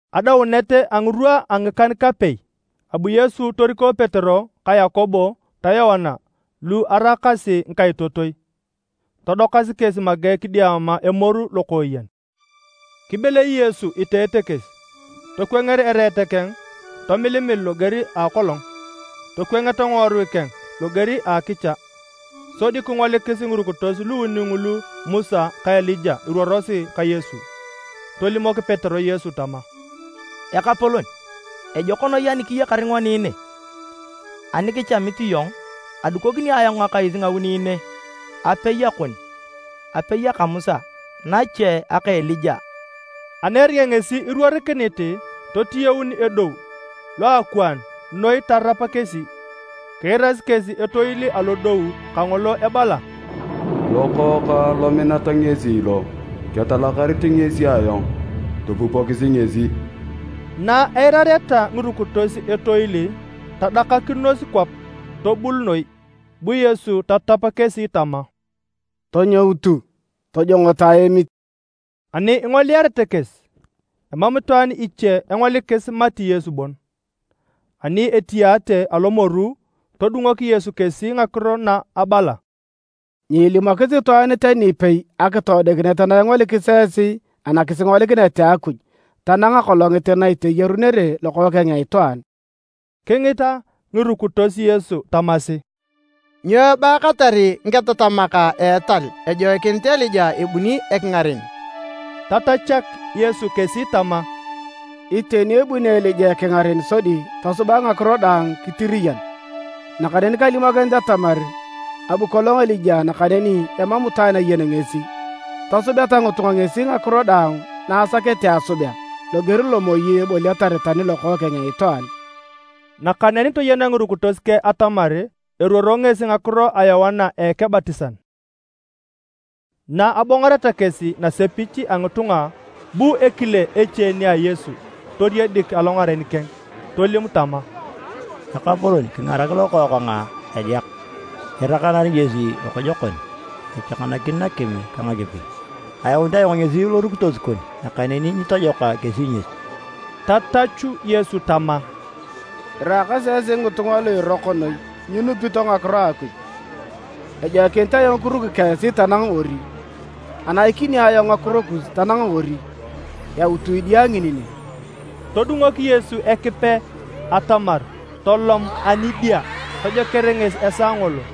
Adaunet a ngirwa a ngikan-kapei, abu Yesu toriko Petero ka Yakobo ta Yoana lu araakasi ngikaitotoi, todokasi kesi make kidiama emoru lokooyen. Kibelei Yesu iteete kesi. Tokwanger ereet keng tomilimil loger a akolong. Tokwangeta ngiworui keng loger a akicha. Sodi kingolikis ngirukitos luuni ngulu Musa ka Elija iruorosi ka Yesu. Tolimok Petero Yesu tama, “Ekapolon, ejok noi ani kiyakar ngoni ne. Ani kichamit iyong, adukokini ayong ngakais ngauni ne, apei akon, apei aka Musa, nache aka Elija.” Ani eringa ngesi iruorikinit, totiyaun edou loakwaan noi tarap kesi. Kiirasi kesi etoil alodou kangolo ebala, “Lokookang lominat ngesi lo. Ketalakarit ngesi ayong. Topupokisi ngesi!” Na eirareta ngirukitos etoil, tadakakinos kwap, tobul noi. Bu Yesu tatap kesi tama, “Tonyoutu. Tojongoto aemit.” Ani ingoliarete kesi, emam itwaan iche engolikis mati Yesu bon. Ani etiyaate alomoru, todungok Yesu kesi ngakiro na abala, “Nyiilimokis itwaan tani ipei akitoodikinet na ingolikis esi anakisingolikinet a Akuj tanang akolongit na iteyarunere Lokookeng a Itwaan.” Kingita ngirukitos Yesu tamasi, “Nyo ebaatar ngiketatamak a etal ejoikinit Elija ebuni ekingaren?” Tatachak Yesu kesi tama, “Iteni ebuni Elija ekingaren sodi tosubak ngakiro daang kitiriyan. Nakaneni kalimokinit atamar abu kolong Elija nakaneni emam itwaan ayen ngesi. Tosubeta ngitunga ngesi ngakiro daang na asakete asubea, loger lo moi eboliatar tani Lokookeng a Itwaan.” Nakaneni toyena ngirukitos keng atamar eruoro ngesi ngakiro a Yoana Ekebatisan. Na abongoreta kesi nasepich a ngitunga, bu ekile eche nia a Yesu toriedik alongaren keng tolim tama, “Ekapolon, kingarak lokookang edeak! Irakanar ngesi lokojokon, echakanakin nakim ka nakipi. Ayaunit ayong ngesi lorukitos kon, nakaneni nyitojoka kesi ngesi.” Tatachu Yesu tama, “Iraakasi esi ngitunga lu iroko noi nyinupito ngakiro a Akuj. Ejoikinit ayong kiruki ka esi tanang ori? Anaikini ayong ngakiro kus tanang ori? Yautu idia ngini ne.” Todungok Yesu Ekipe atamar tolom ani a idia! Tojoker ngesi esaa ngolo.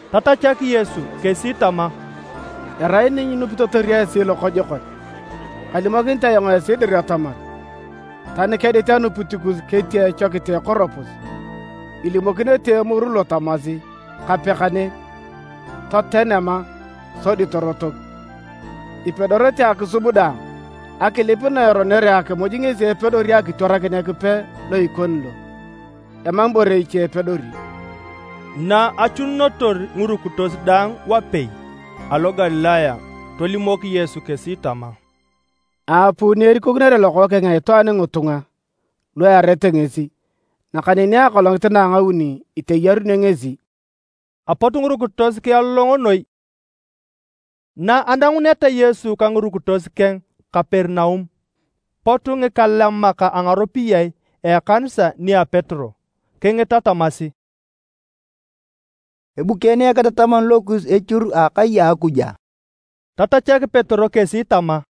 Tatachak Yesu kesi tama, “Erai ni nyinupitotor esi lokojokon. Kalimokinit ayong esi dir atamar, tani kedit anupit kus ketia echokit a ekoropus, ilimokinete emoru lo tamasi, ‘Kape kane, toten ama’ sodi torotok. Ipedorete akisub daang! [ Akilip na eronere akimuj ngesi epedori akitwarakin Ekipe lo ikoni lo. Emam ibore iche epedori!]” Na achununotor ngirukitos daang wapei alo Galilaya, tolimok Yesu kesi tama, “Aapuu ni erikokinere Lokookeng a Itwaan ngitunga lu earete ngesi. Nakaneni akolongit na a ngauni iteyarunio ngesi.” Apot ngirukitos kialolongo noi. Na ananguneta Yesu ka ngirukitos keng Kaperinaum, pot ngikalemak a ngaropiyae a ekanisa nia Petero kingita tamasi, “Ebukeene Eketataman lokus echur a akai a Akuj a?” Tatachak Petero kesi tama,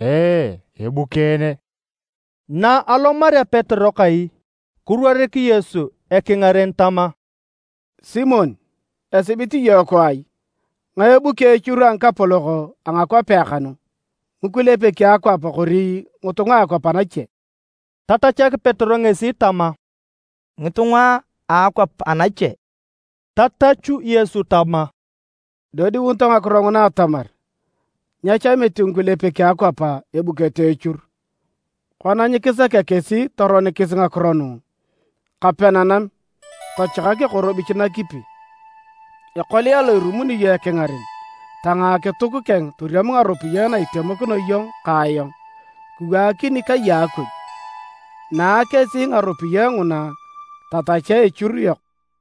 “Ee, ebukeene.” Naalomarea Petero kai, kiruorik Yesu ekingaren tama, “Simon! Esibit iyong kwaai? Ngae ebuki echur a ngikapolok a ngakwapea kanu? Ngikulepek a akwap kori ngitunga a akwap anache?” Tatachak Petero ngesi tama, “Ngitunga a akwap anache.” Tatachu Yesu tama, “Idodiunito ngakiro nguna atamar, nyechamit ngikulepek a akwap ebukete echur. Kona nyikisakea kesi toronikis ngakiro nu, kape nanam, tochakak ekorobich nakipi. Ekolia lo irumuni iyong ekingaren, tangaa akituk keng toriam ngaropiyae na itemokino iyong ka ayong kiwaakini kai a Akuj, naa kesi ngaropiyae nguna tatachea echur yok!”